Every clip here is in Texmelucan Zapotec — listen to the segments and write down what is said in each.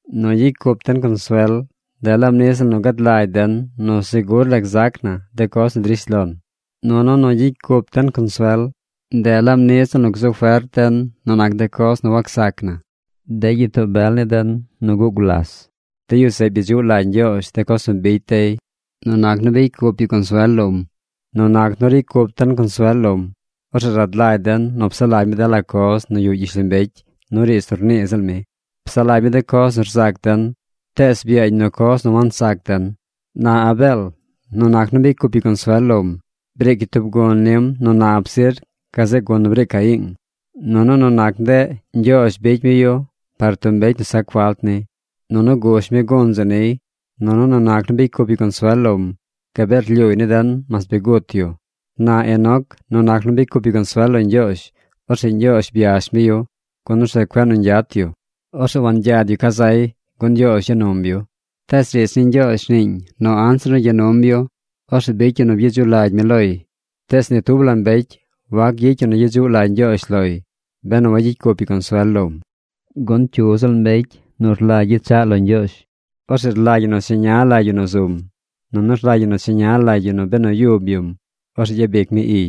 Nu gyicy cup den consuel, ndeꞌ laab niꞌ ziꞌl nu gad lagy den nu segur la gzac na de coz nu drish lon. Nunu nu gyicy cup den consuel, ndeꞌ laab niꞌ ziꞌl nu gzu fert den nu nac de coz nu wacsac na. De gyitoo bel ni den nu guꞌ gulas, de yu zeꞌ byedzuꞌ lagy Ñgyoozh de coz nu bicy dey nu nac nu bicy cup yu consuel lom. Nu nac nu ricy cup den consuel lom, orzeꞌ rad lagy den nu psaꞌ lagy mi de lo la coz nu yuꞌ gyishlombecy nu riidz nu rnii ziꞌl mi. Psaꞌ lagy mi de coz nu rzac den, tees byaañ nu coz nu wansac den. Na Abeel, nu nac nu bicy cup yu consuel lom, briic yu tub gun nim nu nap zir gazeꞌ gun nu briic Caiing. Nunu nu nac ndeꞌ, Ñgyoozh bicy mi yu par tub mbecy nu sac falt ni. Nunu gush mi gun zeꞌ niy. Nunu nu nac nu bicy cup yu consuel lom, gabee rlyuuy ni den mas bi gut yu. Na Enoc, nu nac nu bicy cup yu consuel lo Ñgyoozh, orzeꞌ Ñgyoozh byash mi yu, gun orzeꞌ cueꞌ nu ñgyat yu. Orzeꞌ wangyad yu ca zay, gun Ñgyoozh ya num yu. Tees riidz ni Ñgyoozh rniiñ nu anzir nu gya num yu, orzeꞌ bicy yu nu byedzuꞌ lagy mi loy. Tees ni tub la mbecy wac gyicy yu nu gyedzuꞌ lagy Ñgyoozh loy, benu wagyicy cup yu consuel lom. Gun cyu ziꞌl mbecy nu rlagy gyechaꞌ lo Ñgyoozh, orzeꞌ rlagy ñi nu cheña lagy yu nu zum, nunu rlagy ñi nu cheña lagy yu nu benu yub yum, orzeꞌ gyabic mi iy.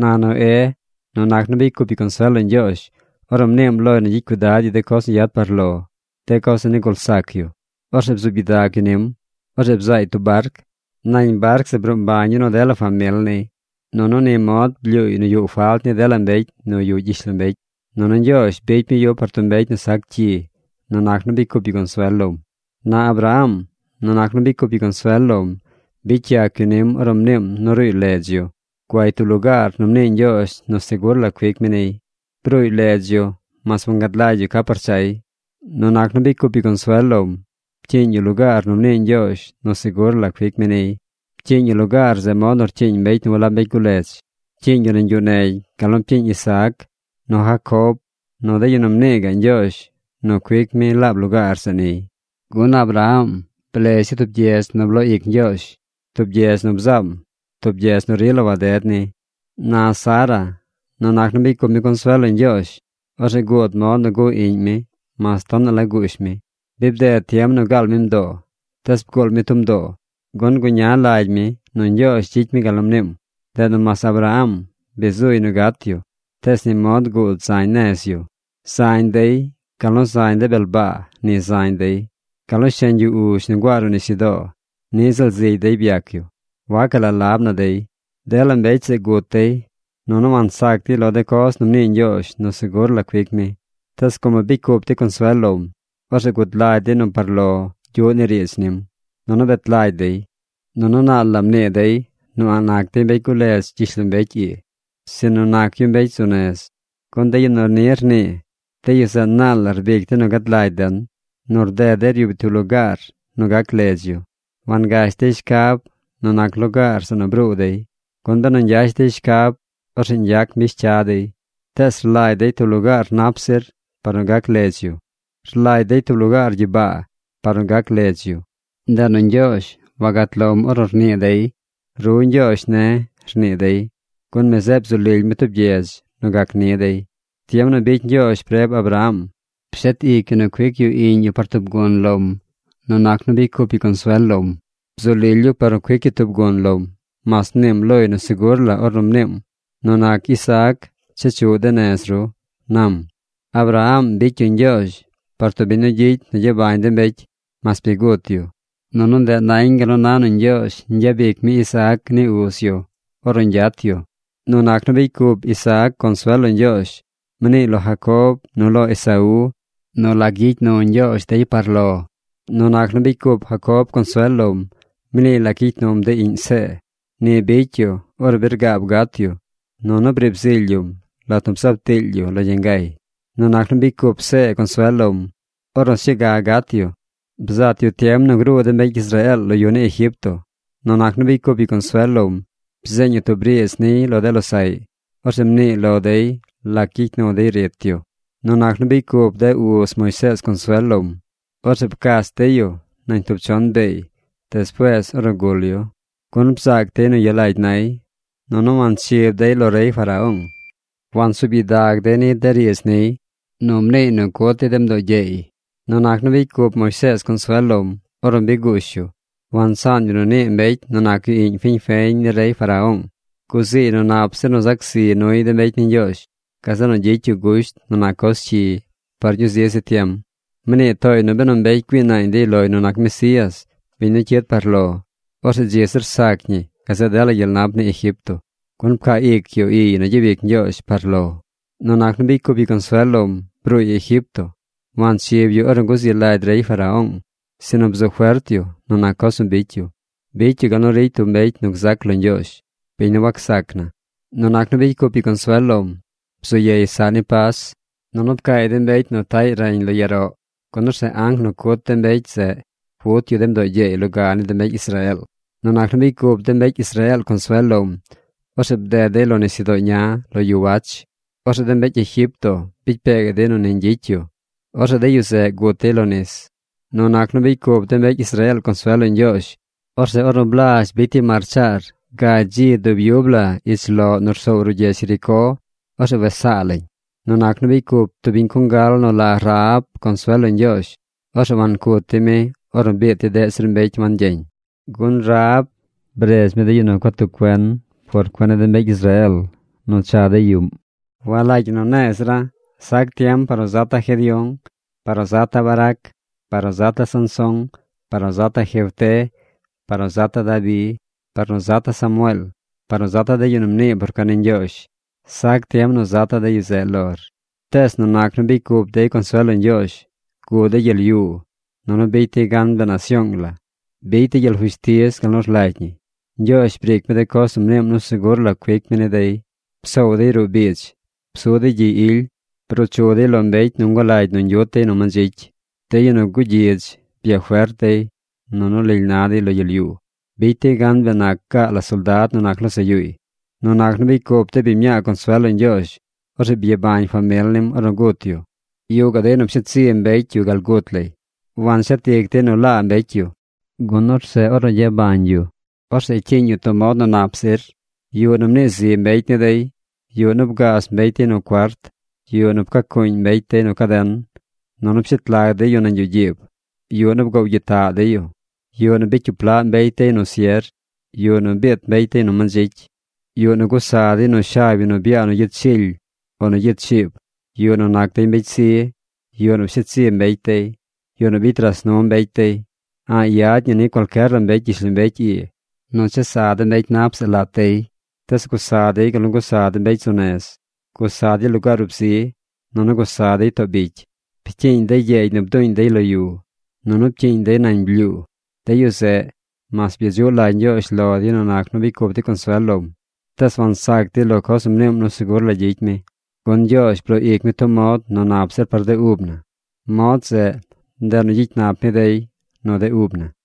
Na Noé, nu nac nu bicy cup yu consuel lo Ñgyoozh, ornu mniim loy nu gyicy cuidad yu de coz nu yad par lo, de coz nu nigul sac yu. Orzeꞌ bzuub gyidag yu nim. Orzeꞌ bzaay tub barc. Nañ barc zeꞌ bruu mbañ yu nu dela famil niy. Nunu ni mod blyuuy nu yuꞌ falt ni dela mbecy nu yuꞌ gyishlombecy. Nunu Ñgyoozh bicy mi yu par tub mbecy nu sac cyi nu nac nu bicy cup yu consuel lom. Na Abraham, nu nac nu bicy cup yu consuel lom, bicy yac yu nim ornu mniim nu ruuy ledz yu. Guay tub lugaar nu mnii Ñgyoozh nu segur la cuic mi niy. Bruuy ledz yu mas wangad lagy yu ca par chay. Nu nac nu bicy cup yu consuel lom, pcyiiñ yu lugaar nu mnii Ñgyoozh nu segur la cuic mi niy. Pcyiiñ yu lugaar zeꞌ mod nu rcyiiñ mbecy nu walab mbecy guledz. Pcyiiñ yu nañ yuꞌ negy gal nu pcyiiñ Isaac, nu Jacob, nu de yu nu mnii gaꞌ Ñgyoozh nu cuic mi laab lugaar zeꞌ niy. Gun Abraham blez yu tub gyedz nu bloo ic Ñgyoozh, tub gyedz nu bzaam, tub gyedz nu rila waded ni. Na Sara, nu nac nu bicy cup mi consuel lo Ñgyoozh, orzeꞌ guud mod nu guꞌ iꞌñ mi mas tonaꞌ la guush mi. Bi bded tiem nu gaal mi mdoo, tees bguul mi tub mdoo, gun guña lagy mi nu Ñgyoozh gyicy mi gal nu mniim. Ndeꞌ nu mas Abraham bi zuy nu gat yu, tees ni mod guud zañ nez yu. Zañ dey. Gal nu zañ de bel baa ni zañ dey. Gal nu sheñ yu uzh nu nguaa ruꞌ nisyudoo niꞌ ziꞌl zigy dey byac yu. Wacaꞌ la lab na dey. Dela mbecy zeꞌ gut dey, nunu wansac dey lo de coz nu mnii Ñgyoozh nu segur la cuic mi. Tees como bicy cup dey consuel lom, orzeꞌ gud lagy dey nu par lo gyuꞌ ni riidz nim, nunu bet lagy dey. Nunu naal la mnii dey nu a̱ꞌ nac dey mbecy guledz gyishlombecy ii, sinu nac yu mbecy zu nez. Gun de yu nu ni rnii, de yu zeꞌ naal la rbic dey nu gad lagy den nu rded dey ryub yu tub lugaar nu gac ledz yu. Wangash dey shcab nu nac lugaar zeꞌ nu bruu dey. Gun benu ñgyash dey shcab, orzeꞌ ñgyac mbish cya dey. Tees rlagy dey tub lugaar nap zir par nu gac ledz yu. Rlagy dey tub lugaar gyibaa par nu gac ledz yu. Ndeꞌ nu Ñgyoozh wagat lom ornu rnii dey: “Ru Ñgyoozh ne̱”, rnii dey, gun mi zeꞌ bzu lily mi tub gyedz nu gac ni dey. Tiem nu bicy Ñgyoozh preb Abraham, pshet ic yu nu cuic yu iꞌñ yu par tub gun lom nu nac nu bicy cup yu consuel lom. Bzu lily yu par nu cuic yu tub gun lom, mas mniim loy nu segur la ornu mniim: “Nu nac Isaac chechuꞌ de nez ru”, nam. Abraham bicy yu Ñgyoozh par tub biñ nu gyicy nu gyabañ de mbecy, mas bi gut yu. Nunu ndeꞌ nañ gal nu na nu Ñgyoozh ñgyabic mi Isaac ni uz yu ornu ñgyat yu. Nu nac nu bicy cup Isaac consuel lo Ñgyoozh, mniiy lo Jacob nu lo Esaú nu lac gyicy nu Ñgyoozh dey par lo. Nu nac nu bicy cup Jacob consuel lom, mniiy lac gyicy num de iꞌñ See. Ni bicy yu ornu bi rgaab gat yu. Nunu briib zily yum lat nu bzaab tiily yu lo yangay. Nu nac nu bicy cup See consuel lom, ornu sñuu ga gat yu, bzat yu tiem nu gruu de mbecy Israeel lo yu ni Egipto. Nu nac nu bicy cup yu consuel lom, bzeeñ yu tub riidz niy lo de losaꞌy. Orzeꞌ mniiy lo dey lac gyicy nu dey rit yu. Nu nac nu bicy cup de uz Moisees consuel lom, orzeꞌ pcach dey yu nañ tub chon beey despuees ornu gul yu. Gun bzaac dey nu yalagy nay nunu wanchib dey lo rey Faraón. Wansuub gyidag dey ni de riidz niy, nu mniiy nu cut dey de mdoo gyeey. Nu nac nu bicy cup Moisees consuel lom, ornu bi guush yu, wansaan yu nu nii mbecy nu nac yu iꞌñ fiñ feñ ni rey Faraón. Guziiy nu nap zir nu zac zi nuy de mbecy ni Ñgyoozh, gazeꞌ nu gyicy yu gusht nu nac coz cyi par ñuu zi zi tiem. Mnii tooy nu benu mbecy güii naañ dey loy nu nac Mesías, biñ nu cyid par lo, orzeꞌ dzi zir sac ñi gazeꞌ dela gyel nap ni Egipto, gun pcaa ic yu iy nu gyabic Ñgyoozh par lo. Nu nac nu bicy cup yu consuel lom, bruuy Egipto. Wanchib yu ornu guzi lagy rey Faraón. Sinu bzu fert yu nu nac coz nu bicy yu. Bicy yu gal nu ricy tub mbecy nu gzac lo Ñgyoozh, biñ nu wacsac na. Nu nac nu bicy cup yu consuel lom, bzu yey saꞌ ni Pas, nunu pcaay de mbecy nu taꞌy reñ lo yaroꞌ, gun orzeꞌ anc nu cut de mbecy zeꞌ wut yu de mdoo gyeey loga ni de mbecy Israeel. Nu nac nu bicy cup de mbecy Israeel consuel lom, orzeꞌ bded dey lo nisyudoo ña lo yu wach. Orzeꞌ de mbecy Egipto bicy pee gaꞌ dey nu ni ñgyicy yu. Orzeꞌ de yu zeꞌ gut dey lo nis. Nu nac nu bicy cup de mbecy Israeel consuel lo Ñgyoozh, orzeꞌ ornu blazh bicy dey marchaar gagy dzi dub yub la ich loꞌ nu rsoow ruꞌ gyedz Jericó, orzeꞌ wes saa lañ. Nu nac nu bicy cup tub biñ congal nu la Rahab consuel lo Ñgyoozh, orzeꞌ wancut dey mi ornu biit dey deꞌ zir mbecy wangyeñ, gun Rahab bredz mi de yu nu gua tuꞌ cuen por cuen ni de mbecy Israeel nu cha dey yuꞌm. Walagy ñi nu ne̱e̱ zira̱. Sac tiem par nu zata̱ Gedeón, par nu zata̱ Barac, par nu zata̱ Sansón, par nu zata̱ Jefté, par nu zata̱ Dabi, par nu zata̱ Samueel, par nu zata̱ de yu nu mnii por cuen ni Ñgyoozh. Sac tiem nu zata̱ de yu zeꞌ lor. Tees nu nac nu bicy cup dey consuel lo Ñgyoozh, guꞌ dey gyel yuu, nunu bicy dey gan bee nasyoong la. Bicy dey gyel fushtiz gal nu rlagy ñi. Ñgyoozh briic mi de coz nu mniim nu segur la cuic mi ni dey. Psoow dey ruꞌ biidz. Psu dey gyi ily. Bruu chu dey lo mbecy nu ngulagy nu ñgyut dey nu mandzicy. De yu nu gugyidz byafert dey. Nunu lily na dey lo gyel yuu. Bicy dey gan bee nac gaa la soldad nu nac losaꞌ yuuy. Nu nac nu bicy cup de biñ mñaa consuel lo Ñgyoozh, orzeꞌ byabañ famil nim ornu gut yu. Yuꞌ gaꞌ dey nu pshet zi mbecy yu gal gut lay. Wanshet ic dey nu laa mbecy yu, gun orzeꞌ ornu gyabañ yu, orzeꞌ cyiiñ yu tub mod nu nap zir. Yuꞌ nu mnii zi mbecy ni dey. Yuꞌ nu bgaaz mbecy dey nu cuart. Yuꞌ nu pca cuuñ mbecy dey nu caden, nunu pshet lag dey yu nañ yuꞌ gyiib. Yuꞌ nu bgoow gyitaꞌ dey yu. Yuꞌ nu bicy cyup laꞌ mbecy dey nu sier. Yuꞌ nu biit mbecy dey nu mandzicy. Yuꞌ nu gusa dey nu shab yu nu byaa nu gyid shily o nu gyid chiib. Yuꞌ nu nac dey mbecy zi. Yuꞌ nu psheed zi mbecy dey. Yuꞌ nu bicy ras nu mbecy dey. A̱ꞌ yad ñi ni cualcyer la mbecy gyishlombecy ii nu chesa de mbecy nap zeꞌ lat dey. Tees gusa dey gal gusa de mbecy zu nez. Gusa dey lugaar ub zi, nunu gusa dey too bicy. Pcyiiñ dey gyeegy nu bduuñ dey lo yu, nunu pcyiiñ dey nañ blyuu. De yu zeꞌ, mas byedzuꞌ lagy Ñgyoozh lo dey nu nac nu bicy cup dey consuel lom, tees wansac dey lo coz nu mniim nu segur la gyicy mi. Gun Ñgyoozh bloo ic mi tub mod nu nap zir par de ub na. Mod zeꞌ, ndeꞌ nu gyicy nap mi dey nu de ub na.